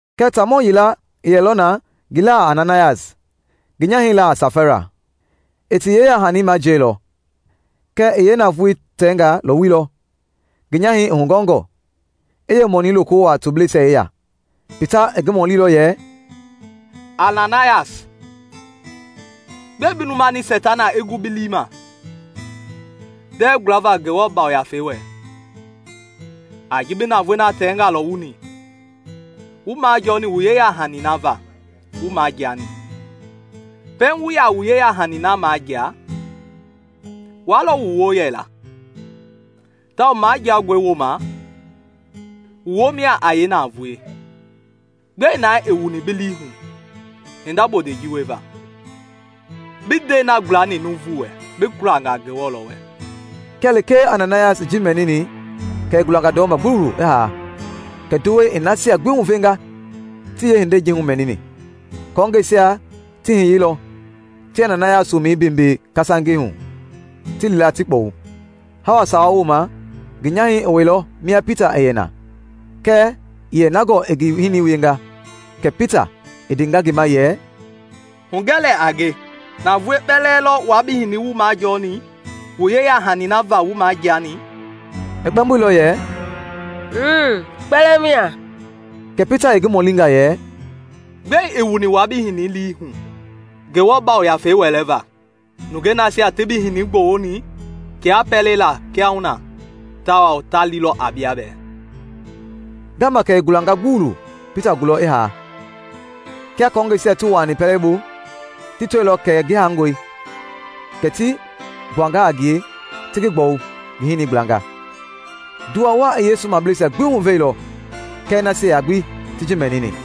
Kɛɛ taamɔ yila i yɛlɔ na ngi laa a Ananayas, ngi nyahɛi laa a Safaira. I ti yeyahani majiɛilɔ kɛɛ i yeenavoei tɛnga lɔwuilɔ, ngi nyahɛi i hugɔngɔ, i yeemɔnii loko wuaa tobleisia yeya. Pita i ngi mɔlilɔ yɛ, “Ananayas, gbɛe bi lumani Seitana i gu bi lii ma ndɛɛ gualava Ngewɔ Yafei wɛ a ji bi navoei na tɛngaa lɔwuni wu majɔɔni wu yeyahani na va wu majiani? Pɛiŋ wu yaa wu yeyahani na majia wua lɔ wu woo yɛla, tawao majiangɔi wooma wu woo mia a yeenavoei. Gbɛe naa i wuni bi lii hu hinda bondei ji wieva? Bii ndɛi na gualani nuuvu wɛ, bi kualanga Ngewɔ lɔ wɛ!” Kia lekee Ananayas i ji mɛnini kɛ i gulanga gbuluwulu i haa, kɛ nduwɛi i nasia gbi huvenga ti yeehindei ji humɛnini. Kɔɔngɛisia ti hiyeilɔ, ti Ananayas womɛi beembee kasangei hu, ti li la ti kpɔwu. Hawa sawa wooma ngi nyahɛi i wɛilɔ mia Pita i yɛ na kɛɛ ii yɛ na gɔɔ i ngi hinii wienga. Kɛ Pita i ndenga ngi ma yɛ, “Hugɛ lɛɛ a nge, navoei kpɛlɛɛ lɔ wua bi hinii wu majɔɔni wu yeyahani na va wu majiani?” I kpɛmboilɔ yɛ, “Mmm, kpɛlɛɛ mia.” Kɛ Pita i ngi mɔlinga yɛ, “Gbɛe i wuni wua bi hinii lii hu Ngewɔ Yafei wɛlɛva? Nungɛi nasia ti bi hinii gbɔwuni tiaa pɛlei laa kiahuna, tawao ta lilɔ a bia bɛɛ!” Ngaama kɛ i gulanga gbuluwulu Pita gulɔ i haa. Kia kɔɔngɛisia ti wuaani pɛlei bu, ti tɔilɔ kɛ ngi haangɔe, kɛ ti gbuanga a ngie ti ngi gbɔwu ngi hinii gblanga. Nduwa waa i Yesu mableisia gbi huveilɔ kɛɛ nasia gbi ti ji mɛnini.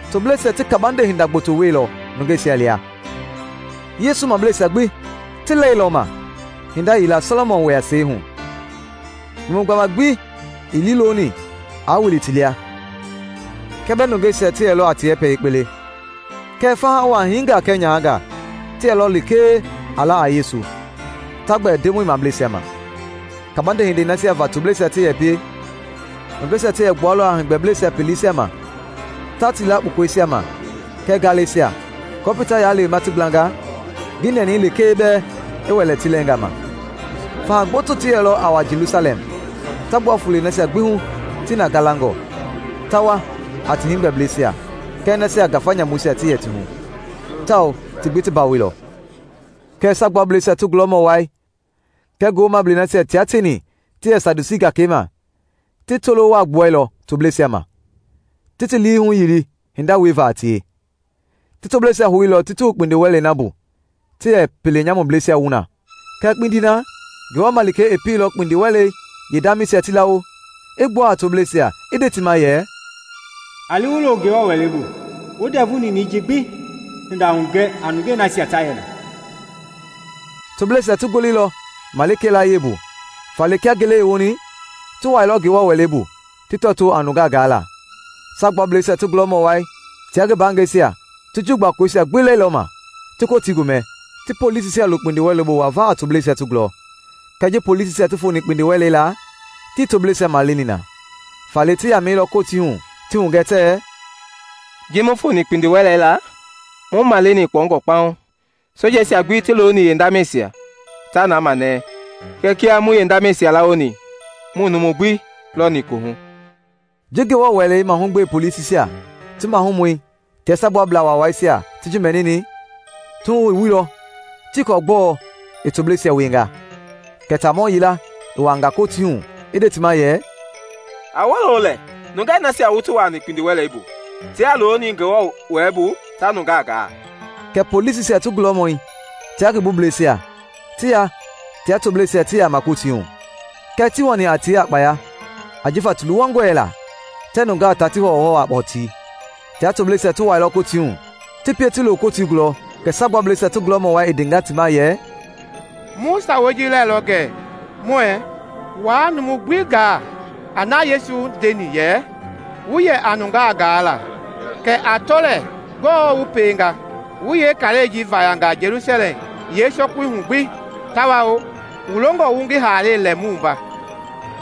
Tobleisia ti kabande hinda gboto wieilɔ nungeisia lia. Yesu Mableisia gbi ti lɛilɔma hinda yila Sɔlɔmɔn wɛɛyasɛi hu. Numu gbama gbi ii liiloni aa wili ti lia kia bɛɛ nungeisia ti yɛlɔ a ti yɛpɛ yekpe le. Kɛɛ faha waa, hiingaa kɛɛ nyahangaa, ti yɛlɔ lekee a la a Yesu, ta gbɛɛ Ndemɔi mableisia ma. Kabande hindei nasia va tobleisia ti yɛ pie, nungeisia ti yɛ gbualɔ a heegbɛbleisia peleisia ma ta ti la kpukɔisia ma kɛɛ ngalɛisia aako Pita i yaa lewema ti gblanga ngi nɛnɛi lekee bɛɛ i wɛlɛ ti lɛɛnga ma. Faha gboto ti yɛlɔ a wa Jelusalɛm ta gbua fulei nasia gbi hu ti na galangɔ, ta wa a ti heegbɛbleisia kɛɛ nasia ngafa nyamuisia ti yɛ ti hu, tawao ti gbi ti bawoilɔ. Kɛɛ Saagbuablɛisia ti gulɔmɔ wai kɛɛ ngi woomablei nasia tia tieni ti yɛ Sadusii gakei ma, ti tolo waa gbuɛilɔ tobleisia ma, ti ti lii huyili hinda wieva a tie. Ti tobleisia houilɔ ti ti wu kpindiwɛlei na bu ti yɛ pienyamublɛisia wu na. Kɛɛ kpindi na Ngewɔ malikei i pieilɔ kpindiwɛlei yeendamɛisia ti lawo, i gbua a tobleisia, i nde ti ma yɛ, “A li wu lo Ngewɔ Wɛlei bu, wu ndɛvu ninɛi ji gbi hinda hugɛ a nungei nasia ta yɛ na.” Tobleisia ti goleilɔ malikei layie bu, faale kia ngele i woni ti wuailɔ Ngewɔ Wɛlei bu ti tɔtoo a nunga gaala. Saagbuablɛisia ti gulɔmɔ wai tia ngi mbaangɛisia ti Juu gbakoloisia gbi lɛilɔma, ti Kotii gomɛ, ti polisisia lo kpindiwɛlei bu wava a tobleisia ti gulɔ. Kɛɛ ji polisisia ti foni kpindiwɛlei laa, tii tobleisia maleni na; faale ti yamɛilɔ Kotii hu ti hugɛ tɛɛ, “Ji mu foni kpindiwɛlei laa, mu maleni kpɔungɔ kpaŋ, sojeisia gbi ti looni yeendamɛisia, ta na manɛɛ; kɛ kia mu yeendamɛisia lawoni muii numu gbi lɔni kohu!” Ji Ngewɔ Wɛlei mahugbe polisisia ti mahumɔi tia Saagbuablaa Waawaisia ti ji mɛnini, ti wuhu i wuilɔ, tii kɔɔ gbɔɔ i tobleisia wienga. Kɛ taamɔ yila i wuaanga Kotii hu i nde ti ma yɛ, “A wolo lɛɛ! Nungɛi nasia wu ti wuni kpindiwɛlei bu tiaa looni Ngewɔ Wɛlei bu ta nungaa gaa!” Kɛ polisisia ti gulɔmɔi tia ngi bublɛisia ti ya tia tobleisia ti yaama Kotii hu, kɛɛ tii wani a tie a kpaya ajifa ti luwangɔ yɛla tɛɛ nungaa taa ti hɔwɔhɔwɔ a kɔtii. Tia tobleisia ti wuailɔ Kotii hu, ti pie ti lo Kotii gulɔ kɛ Saagbuablɛisia ti gulɔmɔ wai i ndenga ti ma yɛ, “Mu sawa lɛilɔ gɛ muɛɛ waa numu gbi gaa a na Yesu ji ndeni yɛ wu yɛ a nungaa gaa la, kɛɛ a tɔ lɛɛ gbɔɔ wu pienga! Wu yeekaai ji vayanga Jelusalɛm yeesɔkui hu gbi, tawao wu longɔ wu ngi haalei lɛ mu wumba!”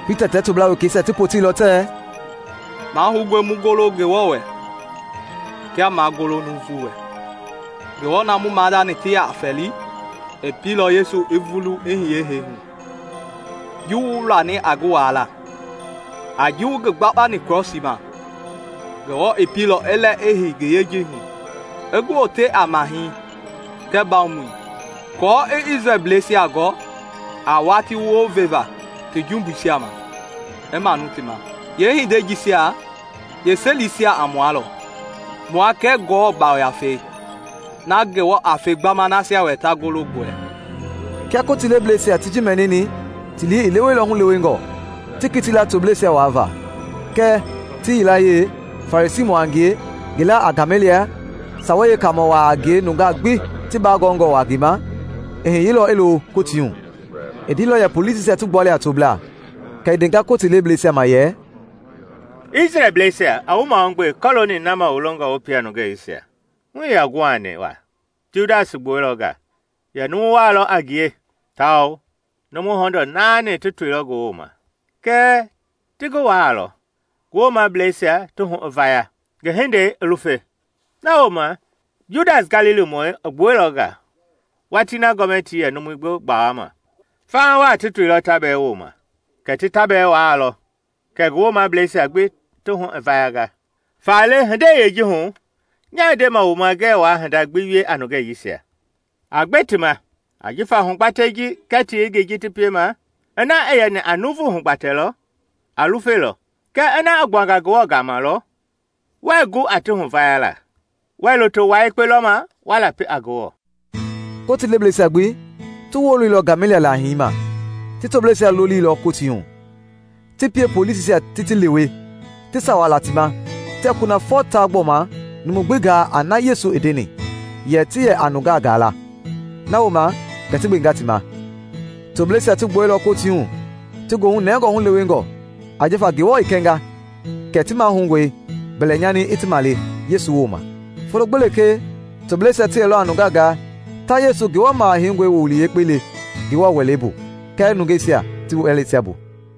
Pita tia toblaa wekeisia ti poteilɔ tɛɛ, “Mahoungɔe mu golo Ngewɔ wɛ kia maa golo nuuvu wɛ. Ngewɔ na mu maadani ti yɛ fɛli i pieilɔ Yesu i vulu i hiye hee hu, ji wu wilani a ngi waala a ji wu ngi gbakpani krɔsii ma. Ngewɔ i pieilɔ i lɛ i hei ngi yejei hu, i ngi wote a Mahɛi kɛɛ Mbawomɔi, aako i Isrɛlbleisia gɔ a watii wounvevaa ti jumbuisia ma i manu ti ma. Yeehindei jisia yeeselisia a mua lɔ -- mua kɛɛ Ngewɔ yafei, na Ngewɔ a fe gbama nasia wɛ ta golo ngi wɛ.” Kia Kotii lebleisia ti ji mɛnini ti lii i leweilɔ hulewengɔ, ti kiti la tobleisia waavaa. Kɛɛ ti yilayee, Farisiimɔ a ngie ngi laa a Gameliɛl, Sawei Yeekaamɔ waa a ngie nungaa gbi ti baa gɔngɔ waa ngi ma, i hiyeilɔ i lo Kotii hu. I ndeilɔ yɛ polisisia ti gbua lɛɛ a tobleisia, kɛ i ndenga Kotii lebleisia ma yɛ, “Isrɛlbleisia, a wu mahugbe kɔlooni na ma wu longɔ wu pie a nungei jisia. Hu ii yaa guhani waa Tiudas i gbuɛilɔ nga, yɛ numu waa lɔ a ngie; tawao numu hɔndɔɔ naani ti toilɔ ngi wooma. Kɛɛ ti ngi waalɔ, ngi woomableisia ti hu i vaya, ngi hindei i lufe. Na wooma, Judas Galilimɔi i gbuɛilɔ nga watii na gɔmɛtii yɛ numui gbi gbawama; faha waa ti toilɔ ta bɛɛ wooma; kɛɛ ti ta bɛɛ waalɔ kɛ ngi woomableisia gbi ti hu i vayanga. Faale, hindei yeeji hu, nyaa ndema wu ma ngɛɛ waa hinda gbi wie a nungei jisia. A gbe ti ma ajifa hugbatɛi ji kɛɛ ti yengei ji ti piema, ina i yɛni a nuuvu hugbatɛ lɔ, a lufelɔ; kɛɛ ina i gbuanga Ngewɔ gama lɔ, wɛɛ gu a ti huvayala. Wɛɛ loto wua yekpe lɔma wa lapi a Ngewɔ!” Kotii lebleisia gbi ti woloilɔ Gameliɛl laahii ma. Ti tobleisia loliilɔ Kotii hu, ti pie polisisia ti ti lewe, ti sawa la ti ma tɛɛ kunafɔ taa gbɔma numu gbi gaa a na Yesu i ndeni yɛ ti yɛ a nungaa gaa la; na wooma kɛ ti gbenga ti ma. Tobleisia ti gbuɛilɔ Kotii hu ti goohu nɛngɔ hulewengɔ ajifa Ngewɔ i kɛnga kɛ ti mahoungɔe mbɛlɛnyani i ti male Yesu wooma. Folo gbi lekee tobleisia ti yɛlɔ a nungaa gaa, ta Yesu, Ngewɔ Maha heingɔi woowili Yekpei le Ngewɔ Wɛlei bu kɛɛ nungeisia ti wɛleisia bu.